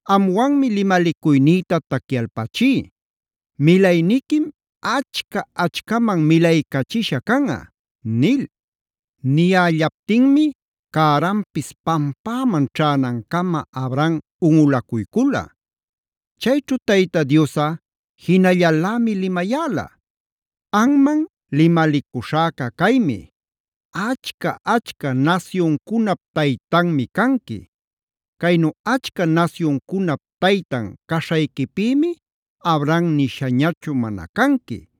Amwanmi limalicuynïta tacyalpachí; milayniquim achca-achcaman milaycachisha canꞌa” nil. Niyällaptinmi cäranpis pampäman ćhänancama Abram unꞌulacuycula. Chayćhu Tayta Diosꞌa jinallalämi limayäla: “Anman limalicuśhäca caymi: Achca-achca nasyuncunap taytanmi canqui. Caynu achca nasyuncunap taytan caśhayquipïmi Abram nishañachu mana canqui,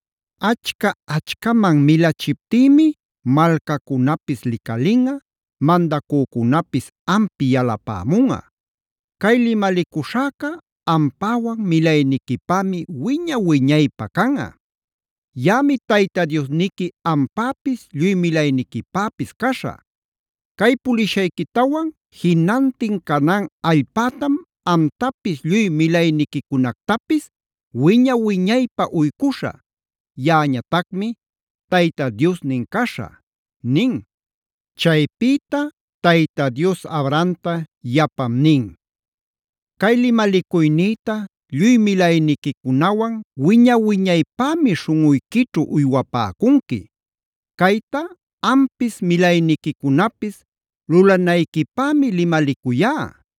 Achca-achcaman milachiptïmi malcacunapis licalinꞌa, mandacücunapis ampi yalapämunꞌa. Cay limalicuśhäca ampäwan milayniquipämi wiña-wiñaypä canꞌa. Yaꞌami Tayta Diosniqui ampäpis lluy milayniquipäpis caśhä. Cay pulishayquïtawan jinantin Canaan allpätam amtapis lluy milayniquicunactapis wiña-wiñaypä uycuśhä.b Yaꞌañatacmi Tayta Diosnin caśhä” nin. Chaypïta Tayta Dios Abrahamta yapam nin: “Cay limalicuynïta lluy milayniquicunawan wiña-wiñaypämi śhunꞌuyquićhu uywapäcunqui. Cayta ampis milayniquicunapis lulanayquipämi limalicuyá: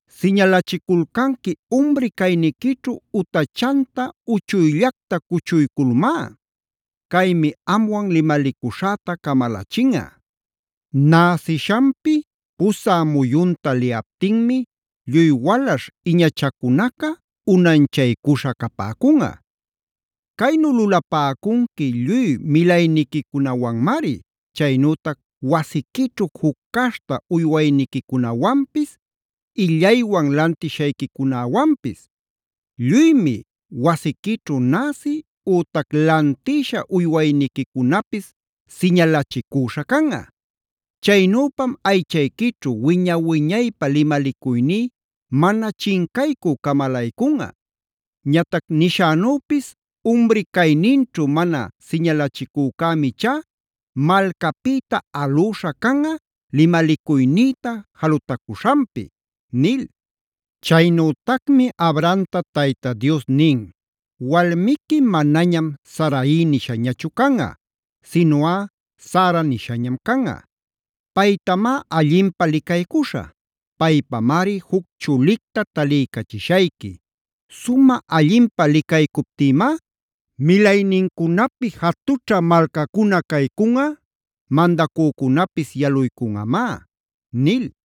Siñalachiculcanqui umri cayniquićhu utachanta uchuyllacta cuchuyculmá. Caymi amwan limalicuśhäta camalachinꞌa. Näsishanpi pusä muyunta liyaptinmi lluy walaśh iñachacunaca unanchaycuśha capäcunꞌa. Caynu lulapäcunqui lluy milayniquicunawanmari, chaynütac wasiquićhu juc caśhta uywayniquicunawanpis, illaywan lantishayquicunäwanpis. Lluymi, wasiquićhu näsi ütac lantïsha uywayniquicunapis siñalachicüśha canꞌa. Chaynüpam aychayquićhu wiña-wiñaypä limalicuyní mana chincaycü camalaycunꞌa. Ñatac nishänüpis umri cayninćhu mana siñalachicücämi ichá malcapïta alüśha canꞌa limalicuynïta jalutacüśhanpi” nil. Chaynütacmi Abrahamta Tayta Dios nin: “Walmiqui manañam Sarai nishañachu canꞌa, sinuꞌa Sara nishañam canꞌa. Paytamá allinpä licaycuśhä. Paypamari juc chulicta taliycachishayqui. Sumä allinpä licaycuptïmá milaynincunapi jatućha malcacuna caycunꞌa, mandacücunapis yaluycunꞌamá” nil.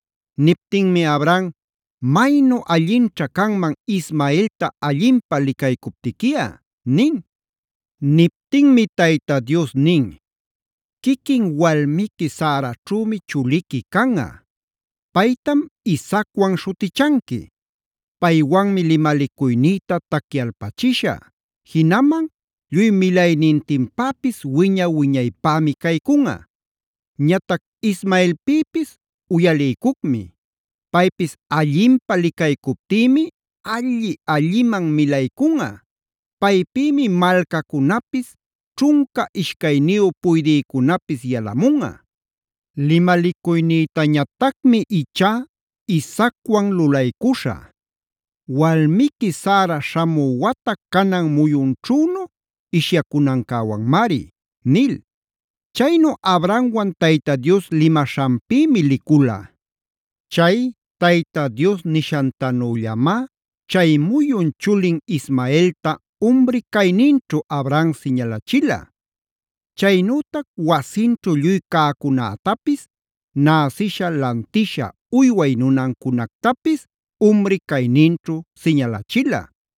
Niptinmi Abraham: “Maynu allinćha canman Ismaelta allinpä licaycuptiquiꞌa” nin. Niptinmi Tayta Dios nin: “Quiquin walmiqui Saraćhümi chuliqui canꞌa. Paytam Isaacwan śhutichanqui. Paywanmi limalicuynïta tacyalpachishä; jinaman lluy milaynintinpäpis wiña-wiñaypämi caycunꞌa. Ñatac Ismaelpïpis uyaliycucmi. Paypis allinpä licaycuptïmi alli-alliman milaycunꞌa. Paypïmi malcacunapis, ćhunca ishcayniyu puydïcunapis yalamunꞌa. Limalicuynïtañatacmi ichá Isaacwan lulaycuśhä; walmiqui Sara śhamü wata canan muyunćhünu ishyacunancäwanmari” nil. Chaynu Abrahamwan Tayta Dios limaśhanpïmi licula. Chay Tayta Dios nishantanüllamá chay muyun chulin Ismaelta umri cayninćhu Abraham siñalachila. Chaynütac wasinćhu lluy cäcunätapis, näsisha lantisha uyway nunancunactapis umri cayninćhu siñalachila.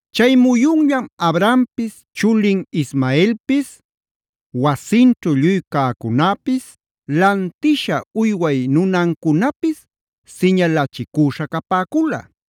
Chay muyunllam Abrahampis, chulin Ismaelpis, wasinćhu lluy cäcunäpis, lantisha uyway nunancunapis siñalachicüśha capäcula.